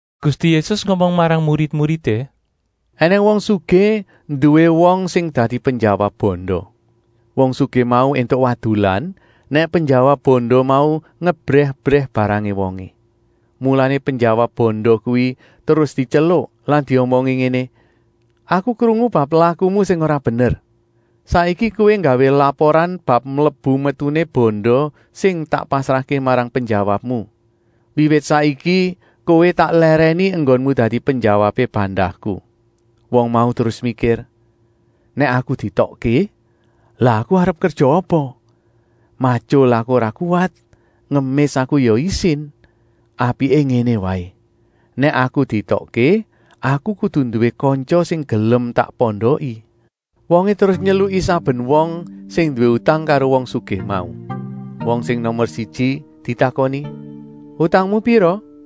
Gusti Yésus ngomong marang murid-muridé: “Enèng wong sugih nduwé wong sing dadi penjawab banda. Wong sugih mau éntuk wadulan, nèk penjawab banda mau ngebrèh-ebrèh barangé wongé. Mulané penjawab banda kuwi terus dityeluk lan diomongi ngéné: ‘Aku krungu bab lakumu sing ora bener. Saiki kowé nggawé laporan bab mlebu-metuné banda sing tak pasrahké marang penjawabmu. Wiwit saiki kowé tak lèrèni enggonmu dadi penjawabé bandaku.’ Wong mau terus mikir: ‘Nèk aku dietokké, lah aku arep kerja apa? Matyul aku ora kuwat, ngemis aku ya isin. Apiké ngéné waé. Nèk aku dietokké, aku kudu nduwé kantya sing gelem tak pondoki!’ “Wongé terus nyeluki saben wong sing nduwé utang karo wong sugih mau. Wong sing nomer siji ditakoni: ‘Utangmu pira?’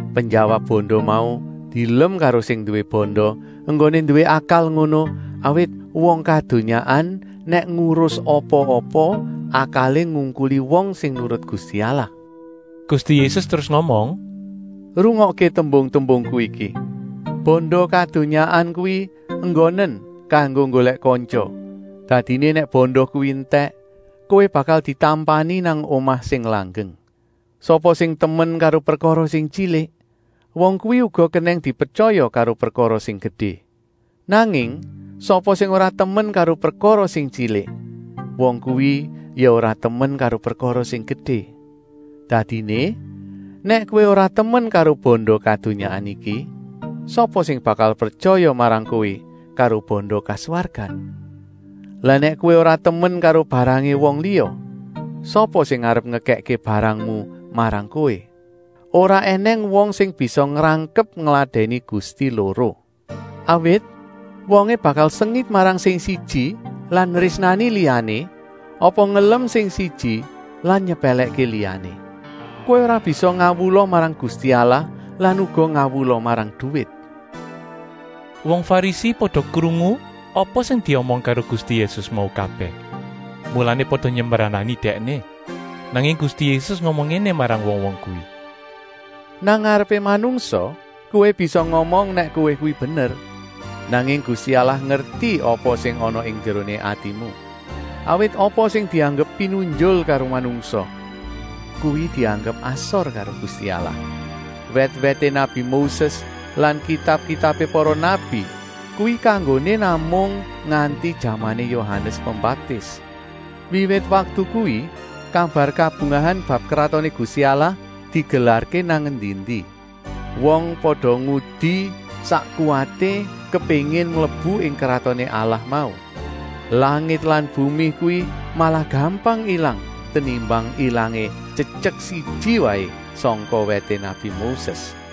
“Penjawab banda mau dielem karo sing nduwé banda enggoné nduwé akal ngono, awit wong kadonyaan nèk ngurus apa-apa akalé ngungkuli wong sing nurut Gusti Allah.” Gusti Yésus terus ngomong: “Rungokké tembung-tembungku iki. Banda kadonyaan kuwi enggonen kanggo nggolèk kantya, dadiné nèk banda kuwi entèk, kowé bakal ditampani nang omah sing langgeng. Sapa sing temen karo prekara sing tyilik, wong kuwi uga kenèng dipretyaya karo prekara sing gedé. Nanging sapa sing ora temen karo prekara sing tyilik, wong kuwi ya ora temen karo prekara sing gedé. Dadiné, nèk kowé ora temen karo banda kadonyaan iki, sapa sing bakal pretyaya marang kowé karo banda kaswargan. Lah nèk kowé ora temen karo barangé wong liya, sapa sing arep ngekèkké barangmu marang kowé? “Ora ènèng wong sing bisa ngrangkep ngladèni gusti loro. Awit wongé bakal sengit marang sing siji lan nrésnani liyané apa ngelem sing siji lan nyepèlèkké liyané. Kowé ora bisa ngawula marang Gusti Allah lan uga ngawula marang duwit.” Wong Farisi pada krungu apa sing diomong karo Gusti Yésus mau kabèh, mulané pada nyembranani Dèkné. Nanging Gusti Yésus ngomong ngéné marang wong-wong kuwi: “Nang ngarepé manungsa kowé bisa ngomong nèk kowé kuwi bener, nanging Gusti Allah ngerti apa sing ana ing njeroné atimu. Awit apa sing dianggep pinunjul karo manungsa, kuwi dianggep asor karo Gusti Allah. “Wèt-wèté nabi Moses lan kitab-kitabé para nabi kuwi kanggoné namung nganti jamané Yohanes Pembaptis. Wiwit waktu kuwi kabar kabungahan bab Kratoné Gusti Allah digelarké nang endi-endi. Wong pada ngudi sak kuwaté kepéngin mlebu ing Kratoné Allah mau. Langit lan bumi kuwi malah gampang ilang, tenimbang ilangé tyetyek siji waé sangka wèté nabi Moses.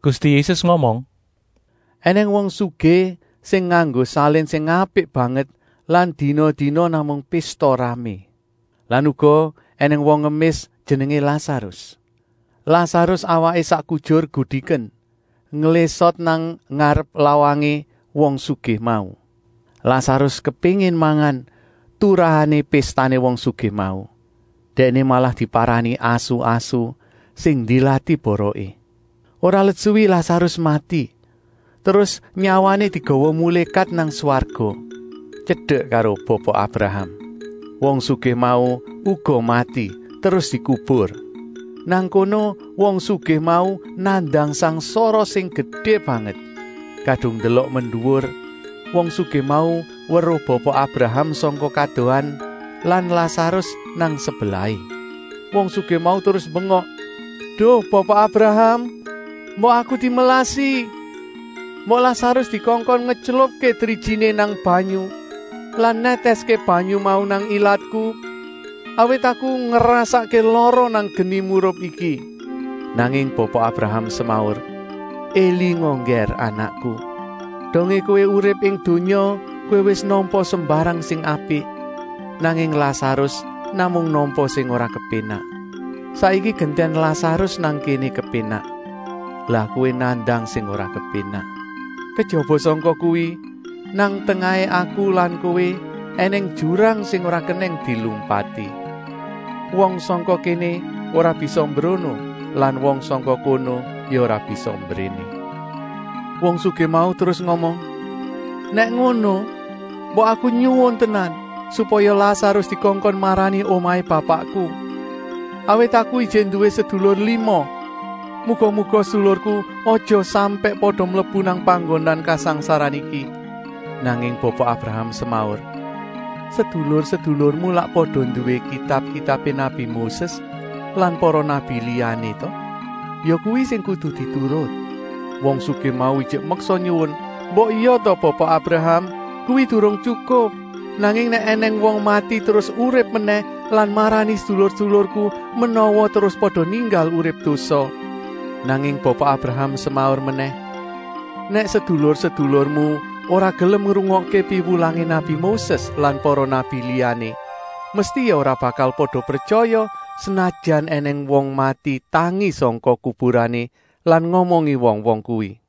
Gusti Yésus ngomong: “Enèng wong sugih sing nganggo salin sing apik banget lan dina-dina namung pésta-ramé. Lan uga ènèng wong ngemis jenengé Lasarus. Lasarus awaké sak kujur gudiken, nglésot nang ngarep lawangé wong sugih mau. Lasarus kepéngin mangan turahané péstané wong sugih mau. Dèkné malah diparani asu-asu sing ndilati boroké. “Ora let suwi Lasarus mati, terus nyawané digawa mulékat nang swarga, tyedek karo Bapa Abraham. Wong sugih mau uga mati terus dikubur. Nang kono wong sugih mau nandang sangsara sing gedé banget. Kadung ndelok menduwur, wong sugih mau weruh Bapa Abraham sangka kadohan lan Lasarus nang sebelahé. Wong sugih mau terus mbengok: ‘Duh Bapa Abraham! Mbok aku dimelasi. Mbok Lasarus dikongkon ngetylupké drijiné nang banyu lan nètèské banyu mau nang ilatku, awit aku ngrasakké lara nang geni murup iki!’ “Nanging Bapa Abraham semaur: ‘Elinga Nggèr anakku, dongé kowé urip ing donya kowé wis nampa sembarang sing apik, nanging Lasarus namung nampa sing ora kepénak. Saiki gentèn Lasarus nang kéné kepénak, lah kowé nandang sing ora kepénak. Kejaba sangka kuwi, nang tengahé aku lan kowé ènèng jurang sing ora kenèng dilumpati. Wong sangka kéné ora bisa mbrono lan wong sangka kono ya ora bisa mbréné.’ Wong sugih mau terus ngomong: ‘Nèk ngono, mbok aku nyuwun tenan, supaya Lasarus dikongkon marani omahé bapakku. Awit aku ijik nduwé sedulur lima. Muga-muga sedulurku aja sampèk pada mlebu nang panggonan kasangsaran iki.’ “Nanging Bapa Abraham semaur: ‘Sedulur-sedulurmu lak pada nduwé kitab-kitabé nabi Moses lan para nabi liyané ta? Ya kuwi sing kudu diturut!’ Wong sugih mau ijik meksa nyuwun: ‘Mbok ya ta Bapa Abraham, kuwi durung tyukup. Nanging nèk ènèng wong mati terus urip menèh lan marani sedulur-sedulurku, menawa terus pada ninggal urip dosa.’ Nanging Bapa Abraham semaur menèh: ‘Nèk sedulur-sedulurmu ora gelem ngrungokké piwulangé nabi Moses lan para nabi liyané, mesti ya ora bakal pada pretyaya, senajan ènèng wong mati tangi sangka kuburané lan ngomongi wong-wong kuwi!’”